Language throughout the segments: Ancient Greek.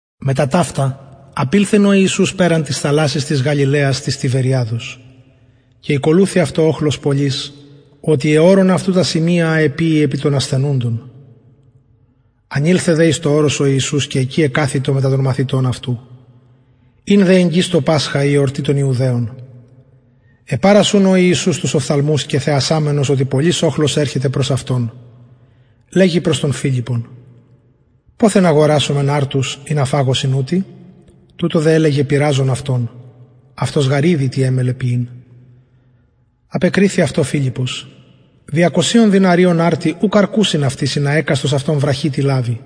μετα ταυτα απηλθεν ο ιησους περαν της θαλασσης της γαλιλαιας της τιβεριαδος και ηκολουθει αυτω οχλος πολυς οτι εωρων αυτου τα σημεια α εποιει επι των ασθενουντων ανηλθεν δε εις το ορος ο ιησους και εκει εκαθητο μετα των μαθητων αυτου ην δε εγγυς το πασχα η εορτη των ιουδαιων επαρας ουν ο ιησους τους οφθαλμους και θεασαμενος οτι πολυς οχλος ερχεται προς αυτον λεγει προς τον φιλιππον ποθεν αγορασομεν αρτους ινα φαγωσιν ουτοι τουτο δε ελεγεν πειραζων αυτον αυτος γαρ ηδει τι εμελλεν ποιειν απεκριθη αυτω φιλιππος διακοσιων δηναριων αρτοι ουκ αρκουσιν αυτοις ινα εκαστος αυτων βραχυ τι λαβη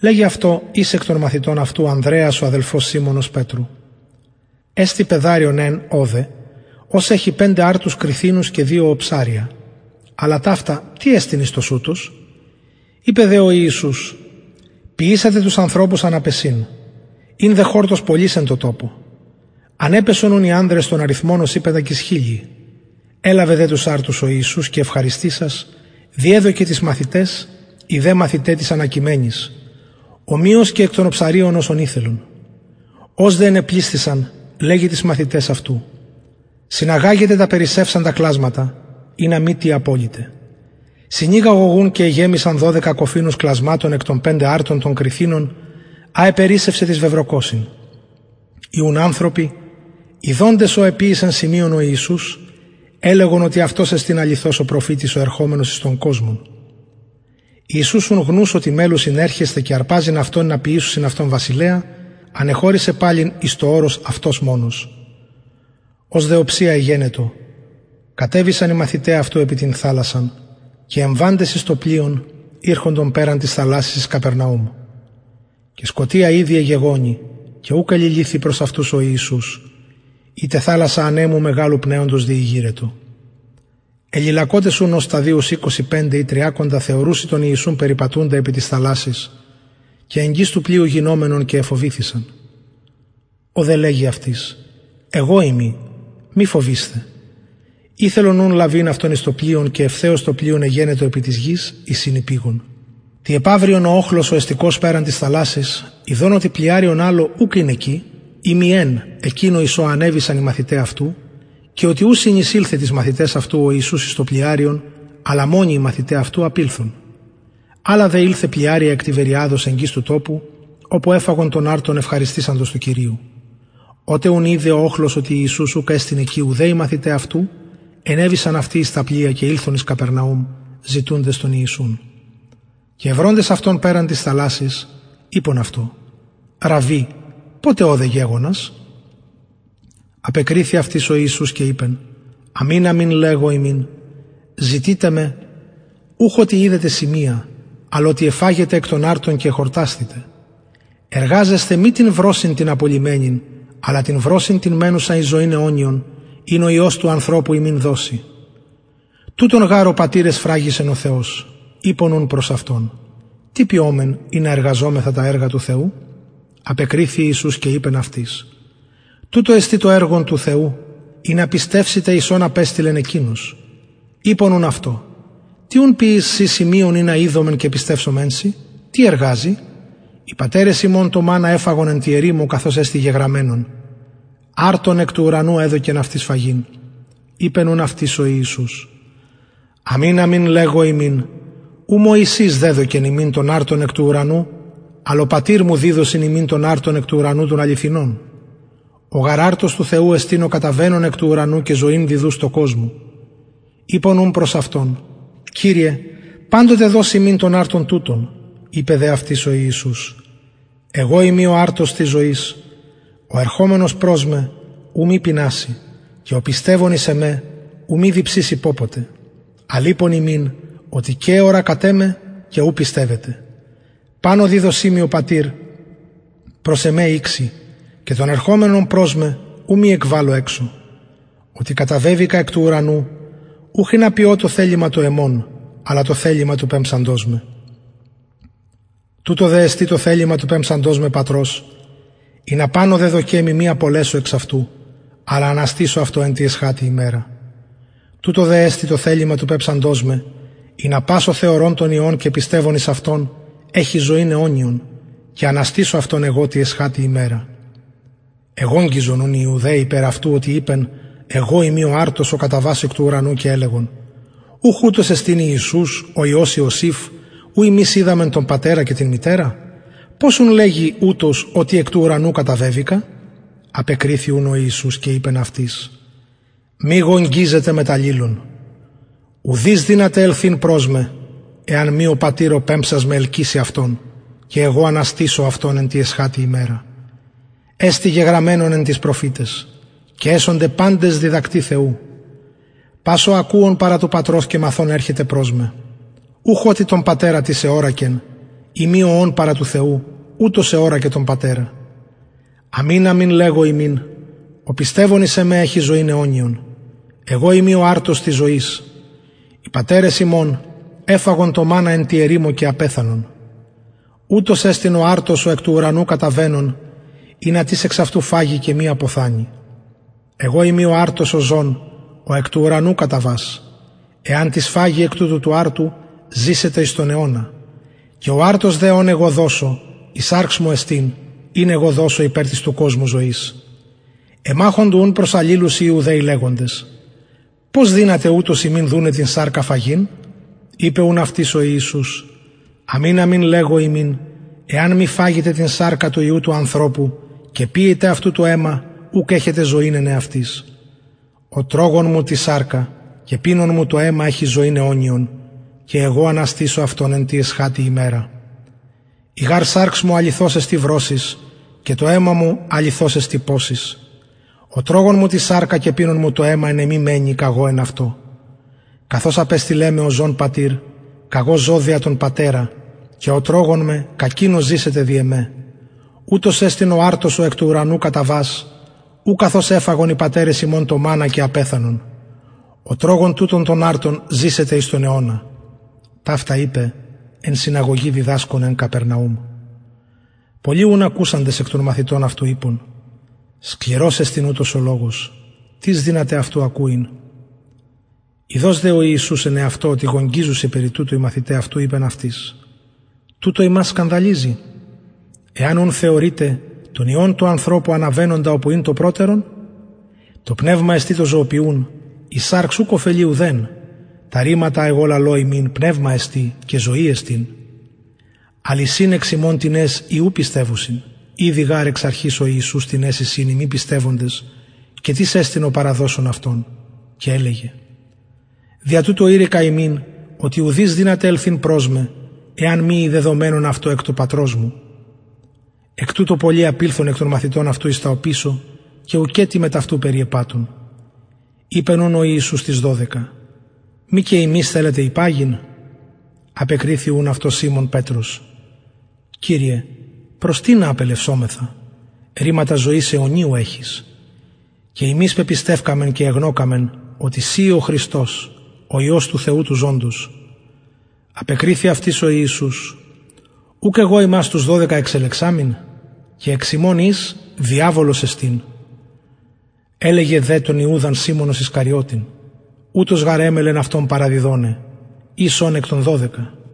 λεγει αυτω εις εκ των μαθητων αυτου ανδρεας ο αδελφος σιμωνος πετρου εστιν παιδαριον εν ωδε ο εχει πεντε αρτους κριθινους και δυο οψαρια αλλα ταυτα τι εστιν εις τοσουτους ειπεν δε ο ιησους ποιησατε τους ανθρωπους αναπεσειν ην δε χορτος πολυς εν τω τοπω ανεπεσον ουν οι ανδρες τον αριθμον ωσει πεντακισχιλιοι ελαβεν δε τους αρτους ο ιησους και ευχαριστησας διεδωκεν τοις μαθηταις οι δε μαθηται τοις ανακειμενοις ομοιως και εκ των οψαριων οσον ηθελον ως δε ενεπλησθησαν λεγει τοις μαθηταις αυτου συναγαγετε τα περισσευσαντα κλασματα ινα μη τι αποληται συνηγαγον ουν και εγεμισαν δωδεκα κοφινους κλασματων εκ των πεντε αρτων των κριθινων α επερισσευσεν τοις βεβρωκοσιν οι ουν ανθρωποι ιδοντες ο εποιησεν σημειον ο ιησους ελεγον οτι ουτος εστιν αληθως ο προφητης ο ερχομενος εις τον κοσμον ιησους ουν γνους οτι μελλουσιν ερχεσθαι και αρπαζειν αυτον ινα ποιησωσιν αυτον βασιλεα ανεχωρησεν εις το ορος αυτος μονος ως δε οψια εγενετο κατεβησαν οι μαθηται αυτου επι την θαλασσαν και εμβαντες εις το πλοιον ηρχοντο περαν της θαλασσης εις καπερναουμ και σκοτια ηδη εγεγονει και ουκ εληλυθει προς αυτους ο ιησους η τε θαλασσα ανεμου μεγαλου πνεοντος διηγειρετο εληλακοτες ουν ως σταδιους εικοσι πεντε η τριακοντα θεωρουσιν τον ιησουν περιπατουντα επι της θαλασσης και εγγυς του πλοιου γινομενον και εφοβηθησαν ο δε λεγει αυτοις εγω ειμι μη φοβεισθε ηθελον ουν λαβειν αυτον εις το πλοιον και ευθεως το πλοιον εγενετο επι της γης εις ην υπηγον τη επαυριον ο οχλος ο εστηκως περαν της θαλασσης ιδων οτι πλοιαριον αλλο ουκ ην εκει ει μη εν εκεινο εις ο ενεβησαν οι μαθηται αυτου και οτι ου συνεισηλθεν τοις μαθηταις αυτου ο ιησους εις το πλοιαριον αλλα μονοι οι μαθηται αυτου απηλθον αλλα δε ηλθεν πλοιαρια εκ τιβεριαδος εγγυς του τοπου οπου εφαγον τον αρτον ευχαριστησαντος του κυριου οτε ουν ειδεν ο οχλος οτι ιησους ουκ εστιν εκει ουδε οι μαθηται αυτου ενεβησαν αυτοι εις τα πλοια και ηλθον εις καπερναουμ ζητουντες τον ιησουν και ευροντες αυτον περαν της θαλασσης ειπον αυτω ραββι ποτε ωδε γεγονας απεκριθη αυτοις ο ιησους και ειπεν αμην αμην λεγω υμιν ζητειτε με ουχ οτι ειδετε σημεια αλλ οτι εφαγετε εκ των αρτων και εχορτασθητε εργαζεσθε μη την βρωσιν την απολλυμενην αλλα την βρωσιν την μενουσαν εις ζωην αιωνιον ην ο υιος του ανθρωπου υμιν δωσει τουτον γαρ ο πατηρ εσφραγισεν ο θεος ειπον ουν προς αυτον τι ποιωμεν ινα εργαζωμεθα τα εργα του θεου απεκριθη ιησους και ειπεν αυτοις τουτο εστιν το εργον του θεου ινα πιστευσητε εις ον απεστειλεν εκεινος ειπον ουν αυτω τι ουν ποιεις συ σημειον ινα ιδωμεν και πιστευσωμεν σοι τι εργαζη οι πατερες ημων το μαννα εφαγον εν τη ερημω καθως εστιν γεγραμμενον αρτον εκ του ουρανου εδωκεν αυτοις φαγειν ειπεν ουν αυτοις ο ιησους αμην αμην λεγω υμιν ου μωσης δεδωκεν υμιν τον αρτον εκ του ουρανου αλλ ο πατηρ μου διδωσιν υμιν τον αρτον εκ του ουρανου τον αληθινον ο γαρ αρτος του θεου εστιν ο καταβαινων εκ του ουρανου και ζωην διδους τω κοσμω ειπον ουν προς αυτον κυριε παντοτε δος ημιν τον αρτον τουτον ειπεν δε αυτοις ο ιησους εγω ειμι ο αρτος της ζωης ο ερχομενος προς με ου μη πειναση και ο πιστευων εις εμε ου μη διψηση πωποτε αλλ ειπον υμιν οτι και εωρακατε με και ου πιστευετε παν ο διδωσιν μοι ο πατηρ προς εμε ηξει και τον ερχομενον προς με ου μη εκβαλω εξω οτι καταβεβηκα εκ του ουρανου ουχ ινα ποιω το θελημα το εμον αλλα το θελημα του πεμψαντος με τουτο δε εστιν το θελημα του πεμψαντος με πατρος ινα παν ο δεδωκεν μοι μη απολεσω εξ αυτου αλλα αναστησω αυτο τη εσχατη ημερα τουτο δε εστιν το θελημα του πεμψαντος με ινα πας ο θεωρων τον υιον και πιστευων εις αυτον εχη ζωην αιωνιον και αναστησω αυτον εγω τη εσχατη ημερα εγογγυζον ουν οι ιουδαιοι περι αυτου οτι ειπεν εγω ειμι ο αρτος ο καταβας εκ του ουρανου και ελεγον ουχ ουτος εστιν ιησους ο υιος ιωσηφ ου ημεις οιδαμεν τον πατερα και την μητερα πως ουν λεγει ουτος οτι εκ του ουρανου καταβεβηκα απεκριθη ουν ο ιησους και ειπεν αυτοις μη γογγυζετε μετ αλληλων ουδεις δυναται ελθειν προς με εαν μη ο πατηρ ο πεμψας με ελκυση αυτον και εγω αναστησω αυτον εν τη εσχατη ημερα εστιν γεγραμμενον εν τοις προφηταις και εσονται παντες διδακτοι θεου πας ουν ο ακουων παρα του πατρος και μαθων ερχεται προς με ουχ οτι τον πατερα τις εωρακεν ει μη ο ων παρα του θεου ουτος εωρακεν τον πατερα αμην αμην λεγω υμιν ο πιστευων εις εμε εχει ζωην αιωνιον εγω ειμι ο αρτος της ζωης οι πατερες υμων εφαγον το μαννα εν τη ερημω και απεθανον ουτος εστιν ο αρτος ο εκ του ουρανου καταβαινων ινα τις εξ αυτου φαγη και μη αποθανη εγω ειμι ο αρτος ο ζων ο εκ του ουρανου καταβας εαν τις φαγη εκ τουτου του αρτου ζησεται εις τον αιωνα και ο αρτος δε ον εγω δωσω η σαρξ μου εστιν ην εγω δωσω υπερ της του κοσμου ζωης εμαχοντο ουν προς αλληλους οι ιουδαιοι λεγοντες πως δυναται ουτος ημιν δουναι την σαρκα φαγειν ειπεν ουν αυτοις ο ιησους αμην αμην λεγω υμιν εαν μη φαγητε την σαρκα του υιου του ανθρωπου και πιητε αυτου το αιμα ουκ εχετε ζωην εν εαυτοις ο τρωγων μου την σαρκα και πινων μου το αιμα εχει ζωην αιωνιον και εγω αναστησω αυτον τη εσχατη ημερα η γαρ σαρξ μου αληθως εστιν βρωσις και το αιμα μου αληθως εστιν ποσις ο τρωγων μου την σαρκα και πινων μου το αιμα εν εμοι μενει καγω εν αυτω καθως απεστειλεν με ο ζων πατηρ καγω ζω δια τον πατερα και ο τρωγων με κακεινος ζησεται δι εμε ουτος εστιν ο αρτος ο εκ του ουρανου καταβας ου καθως εφαγον οι πατερες υμων το μαννα και απεθανον ο τρωγων τουτον τον αρτον ζησεται εις τον αιωνα ταυτα ειπεν εν συναγωγη διδασκων εν καπερναουμ πολλοι ουν ακουσαντες εκ των μαθητων αυτου ειπον σκληρος εστιν ουτος ο λογος τις δυναται αυτου ακουειν ειδως δε ο ιησους εν εαυτω οτι γογγυζουσιν περι τουτου οι μαθηται αυτου ειπεν αυτοις τουτο υμας σκανδαλιζει εαν ουν θεωρητε τον υιον του ανθρωπου αναβαινοντα οπου ην το προτερον το πνευμα εστιν το ζωοποιουν η σαρξ ουκ ωφελει ουδεν τα ρηματα α εγω λαλω υμιν πνευμα εστιν και ζωη εστιν αλλ εισιν εξ υμων τινες οι ου πιστευουσιν ηδει γαρ εξ αρχης ο ιησους τινες εισιν οι μη πιστευοντες και τις εστιν ο παραδωσων αυτον και ελεγεν δια τουτο ειρηκα υμιν οτι ουδεις δυναται ελθειν προς με εαν μη η δεδομενον αυτω εκ του πατρος μου εκ τουτου πολλοι απηλθον των μαθητων αυτου εις τα οπισω και ουκετι μετ αυτου περιεπατουν ειπεν ουν ο ιησους τοις δωδεκα μη και υμεις θελετε υπαγειν απεκριθη ουν αυτω σιμων πετρος κυριε προς τινα απελευσομεθα ρηματα ζωης αιωνιου εχεις και ημεις πεπιστευκαμεν και εγνωκαμεν οτι συ ει ο χριστος ο υιος του θεου του ζωντος απεκριθη αυτοις ο ιησους ουκ εγω υμας τους δωδεκα εξελεξαμην και εξ υμων εις διαβολος εστιν ελεγεν δε τον ιουδαν σιμωνος ισκαριωτην ουτος γαρ εμελλεν αυτον παραδιδοναι εις ων εκ των δωδεκα